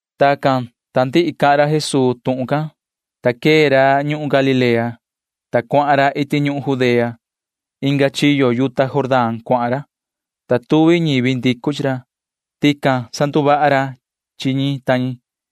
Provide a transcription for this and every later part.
Tacan, ta ndihi cahan ra Jesuu tuhun can, ta quee ra ñuhun Galilea can, ta cuahan ra iti ñuhun Judea. Inga chiyo yuta Jordán cuahan ra, ta tuvi ñivi ndicu chi ra. Tican sanduvaha ra chi ñi ta ñi.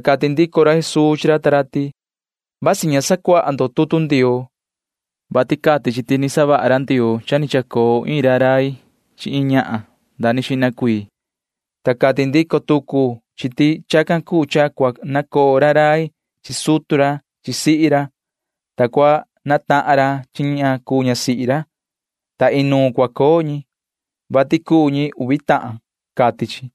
Ta cati ndico ra Jesuu chi ra ta ra ti: ―Vasi ña ta sacuaha ndo tutu Ndioo, vati cati chi ti savaha ra Ndioo cha ni chacoo iin rai chi iin ñahan nda ni xihna cuii, ta cati ndico tucu chi ti chacan cuu cha nacoo iin rai chi sutu ra chi sihi ra, ta natahan ra chi ña cuu ñasihi ra, [ta inuun cua coo ñi,] vati cuu ñi uvi tahan, cati chi.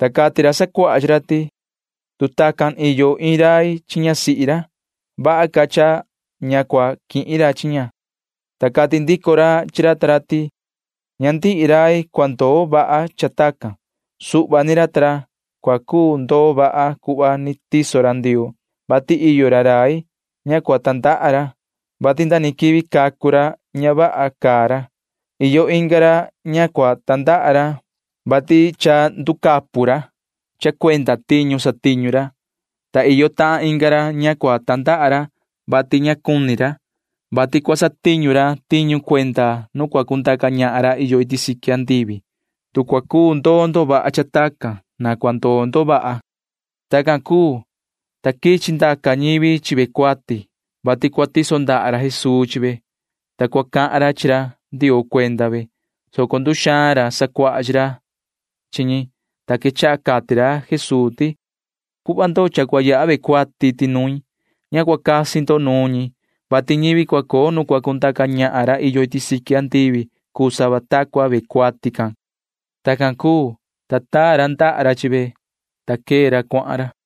Ta cati ra sacuaha chi ra ti: ―Tu tacan iyo iin rai chi ñasihi ra, vaha ca cha ña cua quihin ra chi ña ―cati ra ta ra. Ta cati ndico ra chi ra ta ra ti: ―Ña ndihi rai cua ndoo vaha cha tacan. Iyo suhva ra cua cuu ndoo vaha cuhva ni tiso ra Ndioo, vati iyo ra rai ña cua tandaha ra, vati nda ni quivi cacu ra ña vaha caa ra. Iyo inga ra ña cua tandaha ra, vati cha nducapu ra cha cuenda tiñu satiñu ra, ta iyo tahan inga ra ña cua tandaha ra, vati ña cuni ra, vati cua satiñu ra tiñu cuenda nu cua cundaca ñahan ra iyo iti siqui andivi. Tu cua cuu ndoo ndo vaha cha tacan, na cua ndoo ndo vaha ―cati ra Jesuu chi ra ta ra. Tacan cuu, ta quichi ndaca ñivi chi ve cuati, vati cua tiso ra Jesuu ndaha ra chi ve, ta cua cahan ra chi ra Ndioo cuenda ve, soco nduxaan ra sacuaha chi ra chi ñi, ta quechaha cati ra Jesuu ti: ―Cuhva ndo cha cua yaha ve cuati iti nuin. Ña cua casi ndo nuun ñi, vati ñivi cua coo nu cua cundaca ñahan ra iyo iti siqui andivi cuu sava ta cua ve cuati can ―cati ra. Tacan cuu, ta taa ra ndaha ra chi ve, ta quee ra cuahan ra.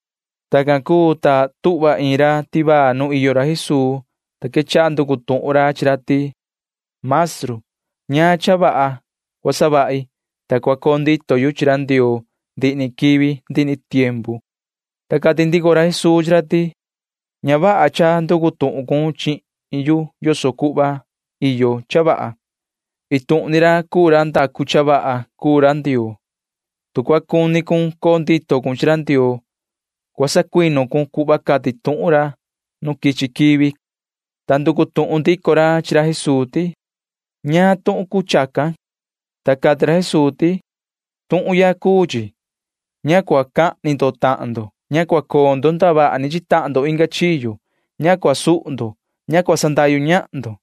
Tacan cuu, ta tuhva iin ra nu iyo ra Jesuu, ta quechaha nducu tuhun ra chi ra ti: ―Yoho maestru, ¿ñaan cha vaha cua savahi, ta cua coo ndito yu chi ra Ndioo ndihi ni quivi ndihi ni tiempu? ―cati ra. Ta cati ndico ra Jesuu chi ra ti: ―Ña vaha cha nducu tuhun cun chihin yu yoso cuhva iyo cha vaha. Iin tuhun ni ra cuu ra ndacu cha vaha. Tu cua cuni cun coo ndito cun chi ra Ndioo, cua sacuinu cun cuhva cati tuhun ra nu quichi quivi ―cati ra Jesuu. Ta nducu tuhun ndico ra chi ra Jesuu ti: ―¿Ñaan tuhun cuu chacan? ―cati ra. Ta cati ra Jesuu ti: ―Tuhun ya cuu chi. Ña cua cahni ndo tahan ndo. Ña cua coo ndo ndavaha ni chi tahan ndo inga chiyo. Ña cua suhu ndo. Ña cua sandahyu ñahan ndo.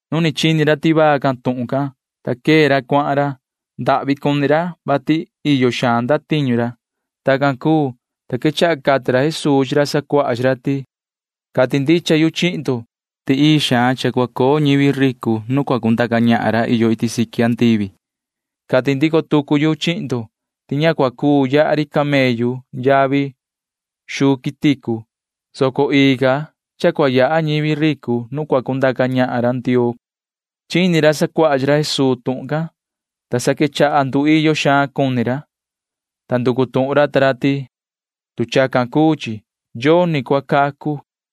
Nu ni chini ra tivaa can tuhun can, ta quee ra cuahan ra. Ndahvi cuni ra, vati iyo xaan ndatiñu ra. Tacan cuu, ta quechaha cati ra Jesuu chi ra sacuaha chi ra ti: ―Cati ndicha yu chihin ndo ti ii xaan cha cua coo ñivi ricu nu cua cundaca ñahan ra iyo iti siqui andivi. Cati ndico tucu yu chihin ndo ti ña cuu yaha ri camellu yavi xuu quiticu, soco ii ca cha cua yaha ñivi ricu nu cua cundaca ñahan ra Ndioo ―cati ra. Chini ra sacuaha chi ra Jesuu tuhun can, ta sa quechaha nduiyo xaan cuni ra, ta nducu tuhun ra ta ra ti: ―Tu chacan cuu chi, yoni cua cacu ―cati ra ta ra.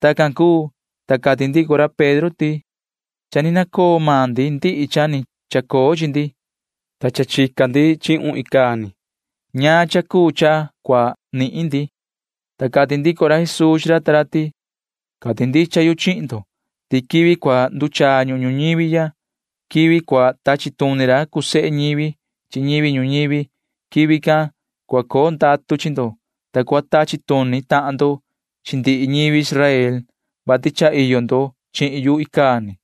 Tacan cuu, ta cati ndico ra Pedro ti: ―Cha ni nacoo maan ndi ndihi cha ni chacoo chi ndi, ta cha chica ndi chihun icaa ni. ¿Ñaan cha cuu cha cua coo chi maan ndi? ―cati ra. Ta cati ndico ra Jesuu chi ra ta ra ti: ―Cati ndicha yu chihin ndo ti quivi cua nduchaa ñuhun ñuñivi ya, quivi cua tachi tuni ra cuu sehe ñivi chi ñivi ñuñivi―quivi can cua coo ndatu chi ndo, ta cua tachi tuni tahan ndo chi ndihi ñivi Israel, vati cha iyo ndo chihin yu icaa ni.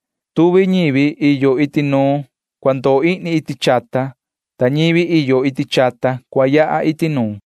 Tuvi ñivi iyo iti nuun cua ndoo ihni iti chata, ta ñivi iyo iti chata cua yaha iti nuun.